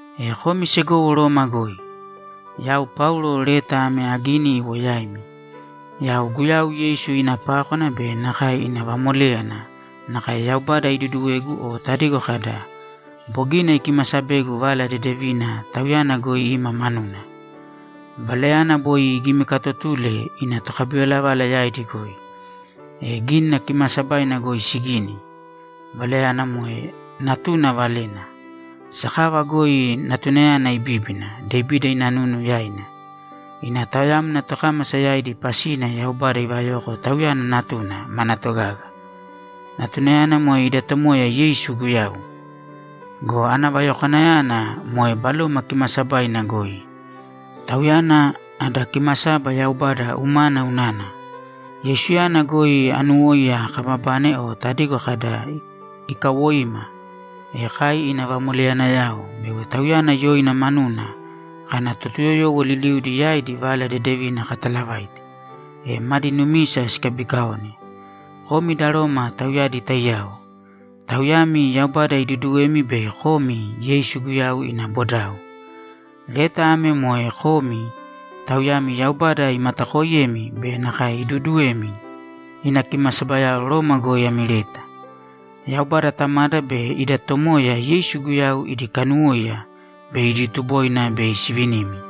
E komi segowo Roma goi, Yau Paulo leta ame agini iwo yaimi. Yau Guyau Yeisu ina pákwana be nakae ina vamoléyana nakae Yaubada iduduwegu o tadigo kada, ‘Bogina ikimasabegu Vala Dedevina Tauyana goi ima manuna.’ Valayana boi igimikaatotule ina tokabivalavala yaidi goi, e Gínina Kimaasabaina goi sigini. Valayana moe Natuna Valena. Sakava goi Natunayana ibíbina Devida ina nunu yaina. Ina taoyamna tokámasa yaidi pasina Yaubada ivayoko Tauyana Natuna mana togaga. Natunayana moe ida Tomoya Yeisu Guyau. Go ana vayokwanayana moe Baloma Kimaasabaina goi, Tauyana ada kimasaba Yaubada umana unana. Yeisuyana goi anuwóiya kababane o tadigo kada, ‘Ikawoima, e kai ina vamoleyanayao’ bego Tauyana yoina manuna kana Totuyoyowo liliudi yaidi Vala Dedevina katalavaite, e madi numisa sikabikaone. Komi da Roma tauyadi taiyao; tauyami Yaubada iduduwemi bei komi Yeisu Guyau ina bodao. Leta ame moe komi, tauyami Yaubada imatakooiyemi be nakae iduuduwemi, ina kimasabayao Roma goi ami leta. Yaubada Tamada be ida Tomoya Yeisu Guyau idi kanuwóiya be idi tuboina bei sivinimi.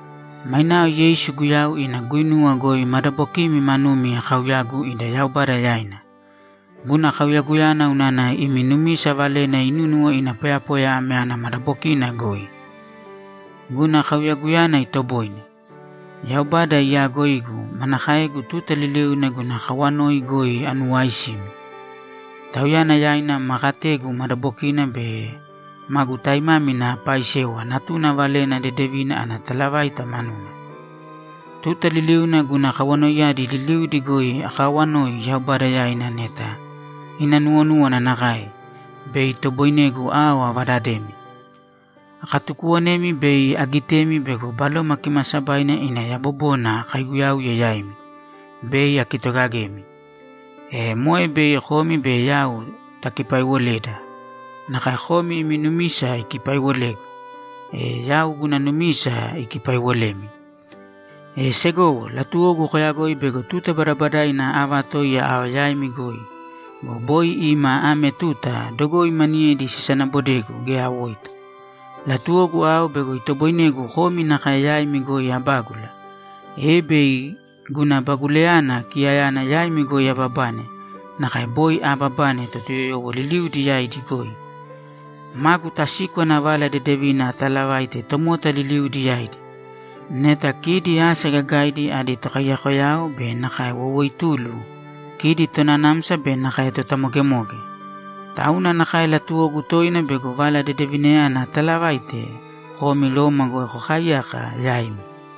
Mainao Yeisu Guyau ina guinuwa goi madabokimi manumi akauyagu ida Yaubada yaina. Guna kauyaguyana unana imi numisa valena inúnuwo ina poyapoya ame ana madabokina goi. Guna kauyaguyana itoboine. Yaubada iyaagoigu manakaegu tuta liliuna guna kawanoi goi anuwaaisimi! Tauyana yaina ma kategu madabokina be magu taimámina apaaisewa Natuna Valena Dedevina ana talavaita manuna. Tuta liliuna guna kawanoiyadi liliudi goi akaawanoi Yaubada yaina neta ina nuwonúwana nakae, bei itoboinegu ao avadademi. Akatukuwonemi bei agitemi bego Baloma Kimaasabaina ina yabobona akaiguyauye yaimi, bei akitogagemi. E moe bei komi be yau takipaiwoleda. Nakae komi imi numisa ikipaiwolegu, e yau guna numisa ikipaiwolemi. E segowo, latuwogu koyagoi bego tuta badabadaina aavatoiya ao yaimi goi go, boi ima ame tuta dogoi maniyedi sisanaabodegu geya awoita. Latuwogu ao bego itoboinegu komi nakae yaimi goi abágula, e bei guna bagulayana kiyayana yaimi goi ababane nakae boi aababane Totuyoyowo liliudi yaidi goi. Magu tasíkwana Vala Dedevina atalavaite tomota liliudi yaidi. Neta kidi asa gagaidi adi tokaiyakoyao be nakae woiwoitulu, kidi tonanamsa be nakae totamogemoge. Tauna nakae latuwogu toina bego Vala Dedevinayana atalavaite komi Roma goi kokaaiyaka yaimi.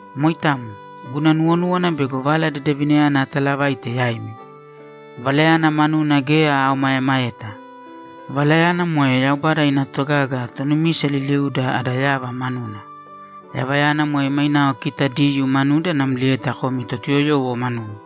Moitamo, guna nuwonúwana bego Vala Dedevinayana atalavaite yaimi. Valayana manuna geya aomaemaeta. Valayana moe Yaubada ina togaga tonumisa liliuda ada yava manuna! Yavayana moe mainao kita Diyuu manuda namlieta komi Totuyoyowo manumi.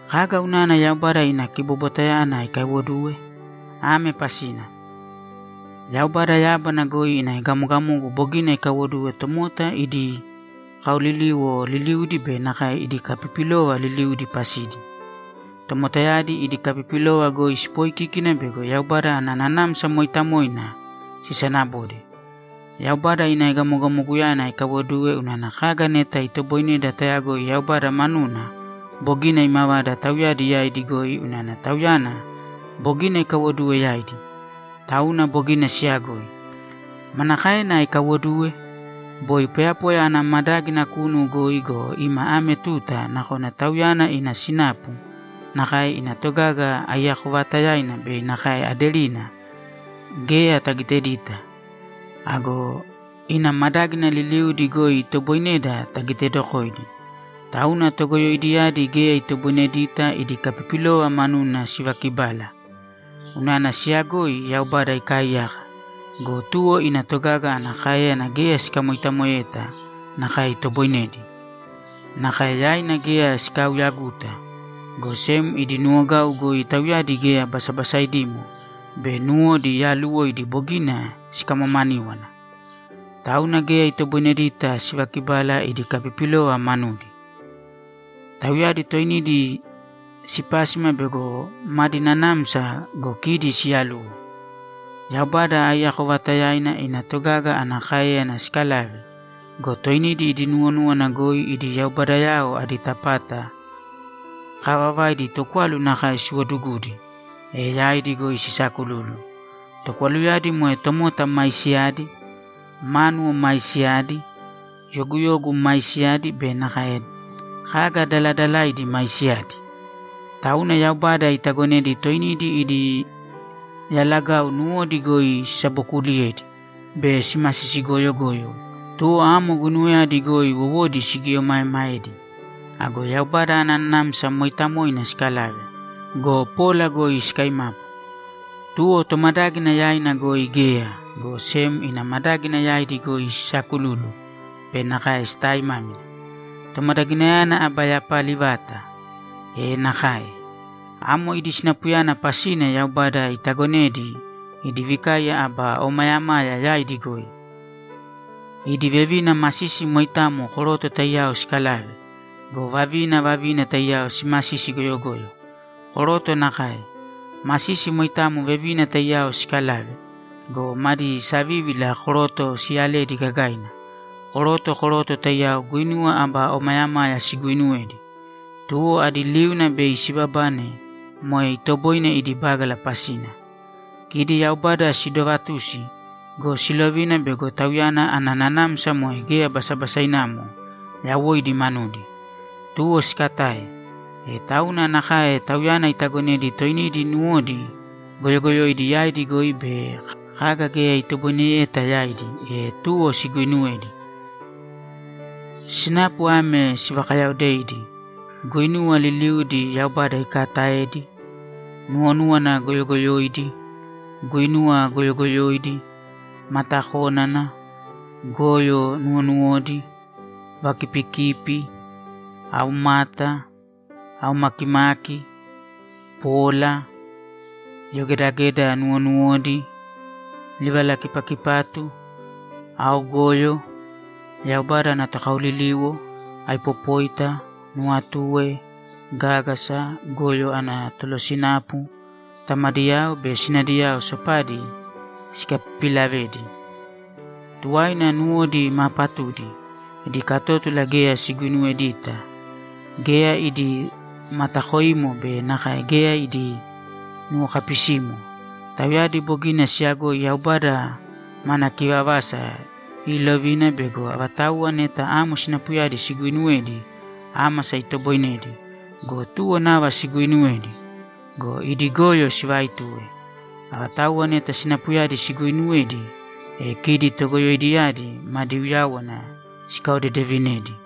Kaga unana Yaubada ina kibobwatayana ikaiwoduwe? Ame pasina: Yaubada yábana goi ina egamogamogu bogina ikaiwoduwe tomota idi kaoliliwo liliudi be nakae idi kapipilova liliudi pasidi. Tomotayadi idi kapipilova goi sipoikíkina bego Yaubada ana Nanamsa Mooitamoina sisanabode. Yaubada ina egamogamoguyana ikaiwoduwe unana kaga neta itoboineda tayagoi Yaubada manuna bogina imavada tauyadi yaidi goi unana Tauyana bogina ikaiwoduwe yaidi, tauna bogina siyagoi. Manakaena ikaiwoduwe? Boi poyapoya ana madágina kunu goi go, ima ame tuta nakona Tauyana ina sinapu, nakae ina togaga aiyako vaatayaina be nakae aderina, geya tagitedita. Ago ina madágina liliudi goi itoboineda tagitedokoidi, tauna togoyoidiyadi geya itoboinedita idi kapipilova manuna sivakibala. Unana siyagoi Yaubada ikaaiyaka go, tuwo ina togaga ana káeyana geya sikamoitamoeyeta nakae itoboinedi. Nakae yaina geya sikauyaguta, go sem idi nuwogau goi tauyadi geya basabasaidimo be nuwodi yaaluwoidi bogina sikamamaníwana. Tauna geya itoboinedita sivakibala idi kapipilova manudi. Tauyadi toinidi sipásima bego madi nanamsa go, kidi siyaluwo. Yaubada aiyako vaatayaina ina togaga ana káeyana sikalave go, toinidi idi nuwonúwana goi idi yaubadayao adi tapata kaavavaidi tokwalu nakae siwodugudi, e yaidi goi sisaakululu. Tokwaluyadi moe tomota maisiyadi, mánuwo maisiyadi, yoguyogu maisiyadi be kaga daladalaidi maisiyadi. Tauna Yaubada itagonedi toinidi idi yalagau nuwodi goi sisabokuuliyedi be simasisi goyogoyo, tuwo amo guinuwayadi goi wowodi sigieomaemaedi. Ago Yaubada ana Nanamsa Mooitamoina sikalave go, pola goi sikaimapu. Tuwo Tomadágina yaina goi geya, go sem ina madágina yaidi goi sisaakululu be nakae sitaaimámina! Tomadaginayana aba yapali vata! E nakae! Amo idi sinapuyana pasina Yaubada itagonedi idi vikaiya aba omayamaya yaidi goi. Idi vevina masisi moitamo koroto taiyao sikalave go, vavina vavina taiyao simasisi goyogoyo. Koroto nakae. Masisi moitamo vevina taiyao sikalave go, madi savívila koroto siyaledi gagaina. Koroto koroto taiyao guinuwa aba omayamaya siguuinuwedi, tuwo adi liuna bei sibabane moe itoboine idi bágala pasina. Kidi Yaubada sidovatusi go, silovina bego Tauyana ana nanamsa moe geya basabasainamo yawoidi manudi, tuwo sikatae, e tauna nakae Tauyana itagonedi toinidi nuwodi goyogoyoidi yaidi goi be kaga geya itoboineyeta yaidi, e tuwo siguuinuwedi. Sinapu ame sivakayaodeidi: Guinuwa liliudi Yaubada ikaataedi, nuwonúwana goyogoyoidi, guinuwa goyogoyoidi, matakónana, goyo nuwonuwodi, vakipikipi, aumata, aumakimaki, pola, yogedageda nuwonuwodi, livalakipakipatu, aogoyo, Yaubada ana tokaoliliwo, aipopóita, nuwatue, gágasa, goyo ana tolosinapu, tamadiyao be sinadiyao sopadi sikapipilavedi. Tuwaina nuwodi maa patudi, idi katótula geya siguinuwedita, geya idi matakoimo be nakae geya idi nuwokapisimo. Tauyadi bogina siyagoi Yaubada mana kivavasa iilovina bego avatauwa neta amo sinapuyadi siguuinuwedi, ámasa itoboinedi go, tuwo nava siguuinuwedi. Go idi goyo sivaituwe. Avatauwa neta sinapuyadi siguuinuwedi, e kidi togoyoidiyadi madi uyáwana sikaodedevinedi!